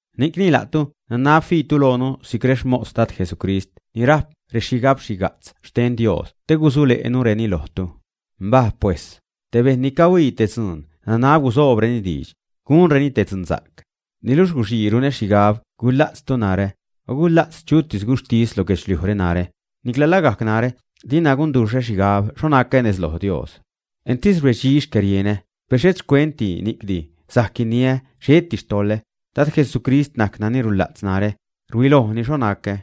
Ni'cni la'tu nanab fiitu loonu si'c rexmos Dad Jesucrist ni rajp rexhigabxhiga'tz xten Dios te gusule'nureni lojtu. Mbaj pues, te bejṉ ni cahuii te dzuun nanab gusoobreni diidx, gunreni te dzunsa'c. Niluxh guxii runä xhigab gula'tztu narä, o gula'tz chutis guxhtis lo guedxliujre narä; nicla lagajc narä dina gunduxhä xhigab xho nacä nez loj Dios. Entis rbedxi xcärienä, per xhet xcuent ni'cdi sajc guiniä xheti xtoḻä, Dad Jesucrist najc nani rula'tz narä, rhuilojni xho nacä.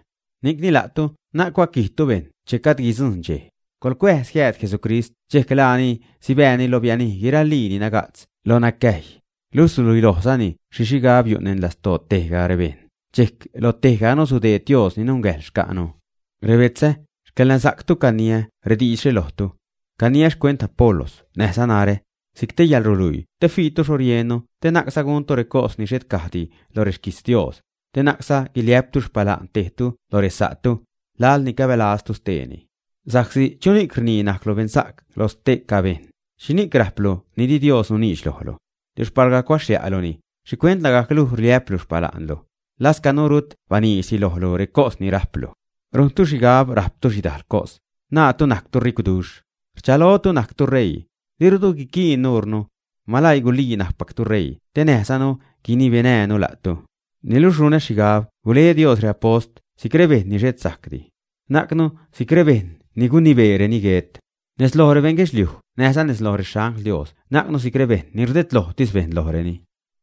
Ni'cni la'tu na'c gucuaquijtu bejṉ che gajd guidzujṉ dxej; coḻcuäjz jiääd Jesucrist dxejc laani sibääni lo bianij guiralii ni naga'tz lo nacäjy, luxh suluilojzani xhi xhigab yu' neṉ lastoo tejga rebejṉ, dxejc lo tejganu sudeed Dios ni nungäjḻ xca'nu. Rebetzä, xcäḻnasa'ctu caniä rediidxre lojtu. Caniä xcuent Apolos näjza narä, si'c te yäḻruluii te fiitu xho riennu te na'cza guntu recos ni xhet caj di lo rexquijtz Dios, te na'cza guiliä'ptu xpala'n tejtu lo resa'tu, laḻ ni cabälaztu steeni. Sa'csi ¿chuni'c rnii najclu beṉsa'cru lo ste'ca bejṉ?, o ¿xhini'c rajplu ni di Dios nuniidx lojlu? Luxh palga cuaxlia'luni, ¿xhicuent lagajc luj rliä'plu xpala'ntu, lascanu rut baniidxdi lojlu recos ni rajplu? Rujntu xhigab rajptu xhidajl cos, naatu najctu ricwduxh, rchalotu najctu ṟeii, dirutu guiquiin nuurnu. Malaii gulii najcpactu ṟeii te näjzanu guinibenäjnu la'tu. Niluxh runä xhigab gule Dios reapost si'c rebejṉ ni xhet sajcdi. Najcnu si'c rebejṉ ni gunibeereni guet. Nez loj rebeṉ guedxliuj näjza nez loj rexangl Dios najcnu si'c rebeṉ ni rdedlojtis bejṉ lojreni.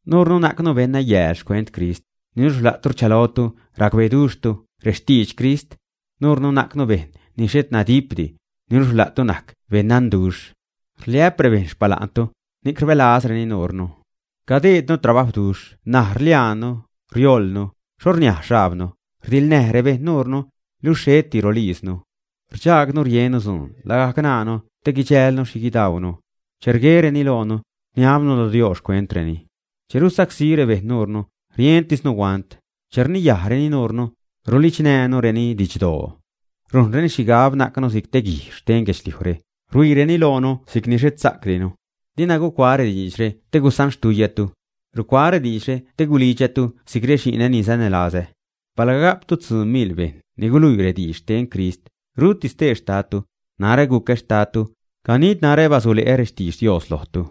Nuurnu najcnu beṉnayääl xcuent Crist, niluxh la'tu rchalotu racbeduxhtu rextidx Crist. Nuurnu najcnu bejṉ ni xhet nadipdi, niluxh la'tu najc beṉdanduxh. Rliä'p rebejṉ xpala'ntu, ni'c rbälazreni nuurnu. Cadeednu trabajwduxh ṉaj, rliaannu, riojlnu, xho rniaj xhajbnu, rdiḻnäj rebejṉ nuurnu, luxh xheti rolijznu. Rdxaagnu riennu dzuun lagajc ṉaanu te guidxälnu xhi guidaunu. Che rguereni loonu, rniabnu lo Dios xcuentreni. Che rusacsí rebejṉ nuurnu, rientisnu huant. Che rniyajreni nuurnu, rulidxnäänureni didxdoo. Rujnreni xhigab najcnu si'c guijxh xten guedxliujre, ruhuiireni loonu si'cni xhet sajcdinu. Dina gucuaä rediidxre te gusanxtuiyätu. Rucuaä rediidxre te gulidxätu si'c rexi'nä ni sanälazä. Palga ga'ptu tzuu miḻ bejṉ ni guluiitu rediidx xten Crist, ruti stee xtadtu; narä gucä xtadtu, ganid narä basule'ä rextidx Dios lojtu.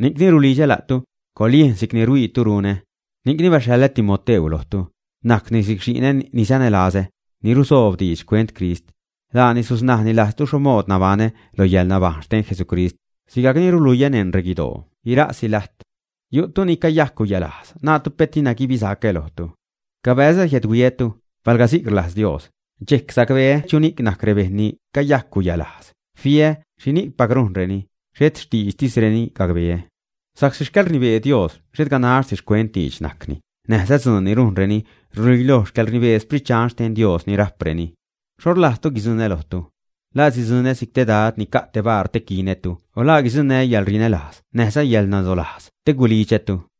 Ni'cni rulidxä la'tu, coḻyejn si'cni ruhuiitu runä. Ni'cni baxhaḻä Timoteu lojtu, najcni si'c xi'nä ni sanälazä, ni rusoob diidx xcuent Crist. Laani susnajni lajztu xho mood nabaṉä lo yäḻnabajṉ xten Jesucrist, sigajcni ruluiä neṉ reguidoo guiraasi lajt. Yu'tu ni acayajc guyalajz, naatu pet dina guibisacä lojtu. Cabäzä jiädhuiätu, palga si'c rlajz Dios, dxejc sacbeä chuni'c najc rebejṉ ni cayajc guyalajz, fiä xhipacni rujnreni, xhet xtiidxtisreni gacbeä. Sa'csi xcäḻrnibee Dios xhet ganaxtis xcuent diidx najcni, näjza dzuun ni rujnreni ruluiloj xcäḻrnibee Sprit Dxan xten Dios ni rajpreni. ¿Xho rlajzzatu guidzuṉä lojtu, ä? ¿La sidzuṉä si'c te dad ni ca' te baar te quinätu o la guidzuṉnää́ yäḻrinälajz näjza yäḻnadolajz te gulidxätu, ä?